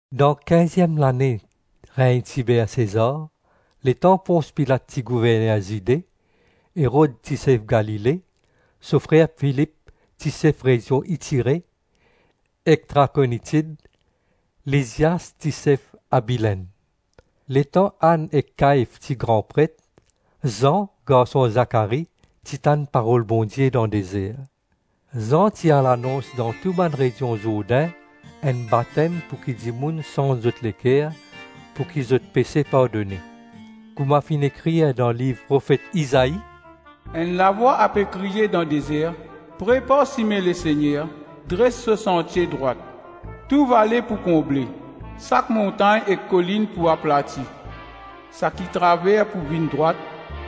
Dan kinziem lane regn Tiber Sezar, letan Pons Pilat ti gouverner Zide, Erod ti sef Galile, so frer Filip ti sef rezion Itire ek Trakonitid, Lizias ti sef Abilenn; letan Ann ek Kaif ti gran pret, Zan garson Zakari ti tann parol Bondie dan dezer. Zan ti al anons dan tou bann rezion Zourdin enn batem pouki dimoun sanz zot leker, pouki zot pese pardone. Kouma finn ekrir dan liv profet Izai, “Enn lavwa ape kriye dan dezer, prepar sime Lesegner, dres so santie drwat. Tou vale pou konble, sak montagn ek kolinn pou aplati, saki traver pou vinn drwat,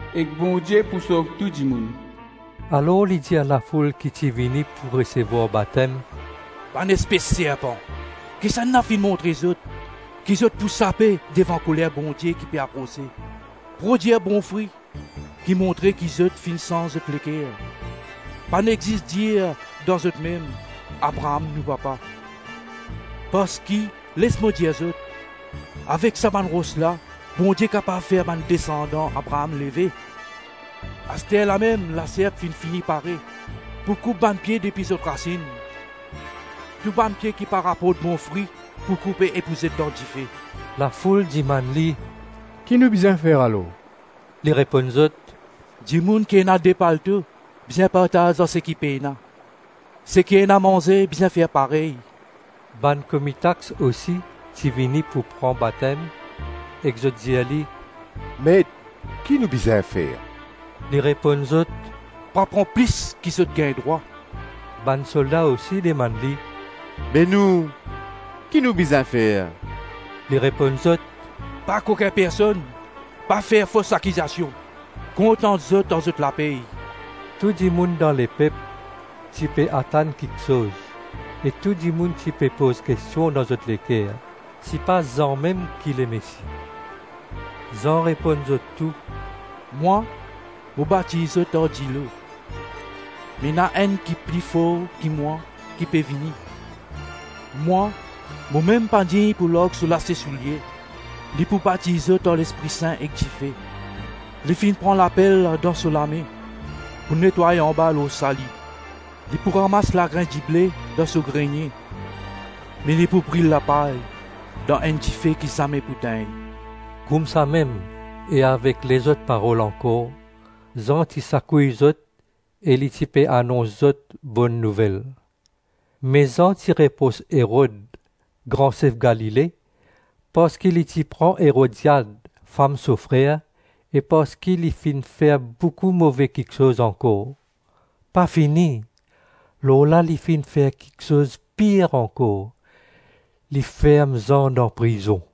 ek Bondie pou sov tou dimoun.” Alor li ti dir lafoul ki ti vini pou resevwar batem, “Bann espes serpan, kisannla finn montre zot ki zot pou sape devan koler Bondie ki pe aprose? Prodwir bon fri ki montre ki zot finn sanz zot leker. Pa nek zis dir dan zotmem, ‘Abraam nou papa!’ Parski les mo dir zot, avek sa bann ros la, Bondie kapav fer bann desandan Abraam leve. Asterlamem laserp finn fini pare pou koup bann pie depi zot rasinn. Tou bann pie ki pa raport bon fri pou koupe e pou zet dan dife.” Lafoul dimann li, “Ki nou bizin fer alor?” Li reponn zot, “Dimoun ki ena de palto bizin partaz ar seki pena, seki ena manze bizin fer parey.” Bann komi tax ousi ti vini pou pran batem ek zot dir li, “Met, ki nou bizin fer?” Li reponn zot, “Pa pran plis ki zot gagn drwa.” Bann solda ousi dimann li, “Be nou, ki nou bizin fer?” Li reponn zot, “Pa kokin personn, pa fer fos akizasion; kontant zot ar zot lapey.” Tou dimoun dan lepep ti pe atann kiksoz, ek tou dimoun ti pe poz kestion dan zot leker, sipa Zan mem ki Lemesi. Zan reponn zot tou, “Mwa, mo batiz zot ar dilo; me ena enn ki pli for ki mwa ki pe vini; mwa, mo mem pa dign pou larg so lase soulie; li pou batiz zot ar Lespri Sin ek dife. Li finn pran lapel dan so lame pou netway anba lor sali; li pou ramas lagrin dible dan so grenie, me li pou bril lapay dan enn dife ki zame pou tegn.” Koumsamem e avek lezot parol ankor, Zan ti sakouy zot e li ti pe anons zot Bonn Nouvel. Me Zan ti repros Erod, gran sef Galile, parski li ti pran Erodiad, fam so frer, e parski li finn fer boukou move kiksoz ankor; pa fini, lor la li finn fer kiksoz pir ankor, li ferm Zan dan prizon.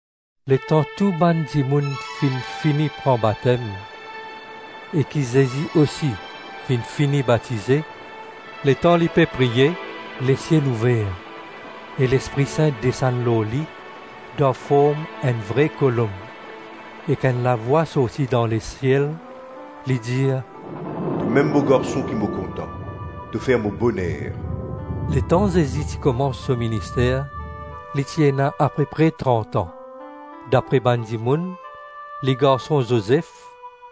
Letan tou bann dimoun finn fini pran batem, e ki Zezi ousi finn fini batize, letan li pe priye, lesiel ouver, e Lespri Sin desann lor li dan form enn vre kolonb, ek enn lavwa sorti dan lesiel, li dir, “Tomem mo Garson ki mo kontan, to fer mo boner.” Letan Zezi ti koumans so minister li ti ena ape pre trant-an. Dapre bann dimoun, li garson Zozef,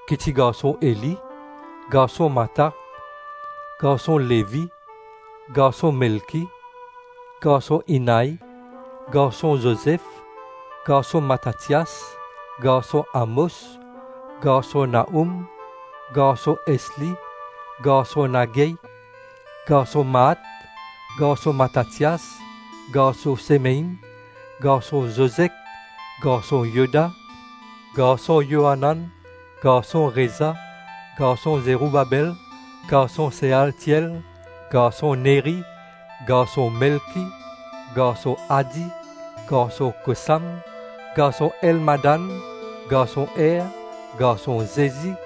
ki ti garson Eli, garson Matat, garson Levi, garson Melki, garson Innai, garson Zozef, garson Matatias, garson Amos, garson Nahoum, garson Esli, garson Nagai, garson Maat, garson Matatias, garson Semein, garson Zozek, garson Yoda, garson Yoanan, garson Reza, garson Zeroubabel, garson Sealtiel, garson Neri, garson Melki, garson Adi, garson Kosam, garson Elmadan, garson Er, garson Zezi,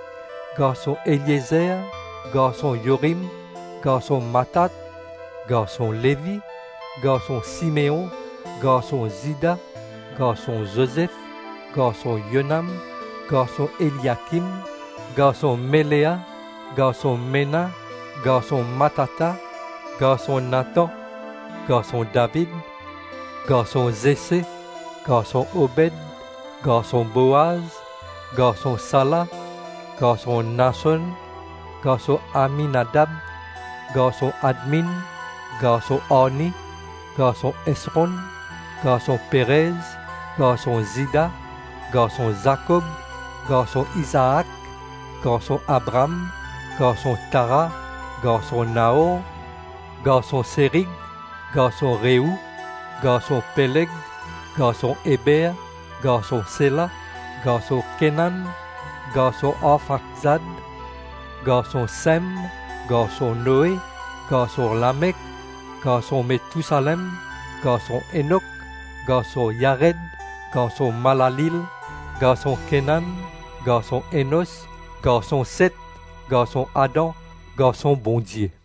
garson Eliezer, garson Yorim, garson Matat, garson Levi, garson Simeon, garson Zida, garson Zozef, garson Yonam, garson Eliakim, garson Melea, garson Mena, garson Matata, garson Natan, garson David, garson Zese, garson Obed, garson Boaz, garson Sala, garson Nason, garson Aminadab, garson Admin, garson Arni, garson Esron, garson Perez, garson Zida, garson Zakob, garson Izaak, garson Abraam, garson Tara, garson Naor, garson Serig, garson Reou, garson Peleg, garson Eber, garson Sela, garson Kenan, garson Arfakzad, garson Sem, garson Noe, garson Lamek, garson Metousalem, garson Enok, garson Yared, garson Malaleel, garson Kenan, garson Enos, garson Set, garson Adam, garson Bondie.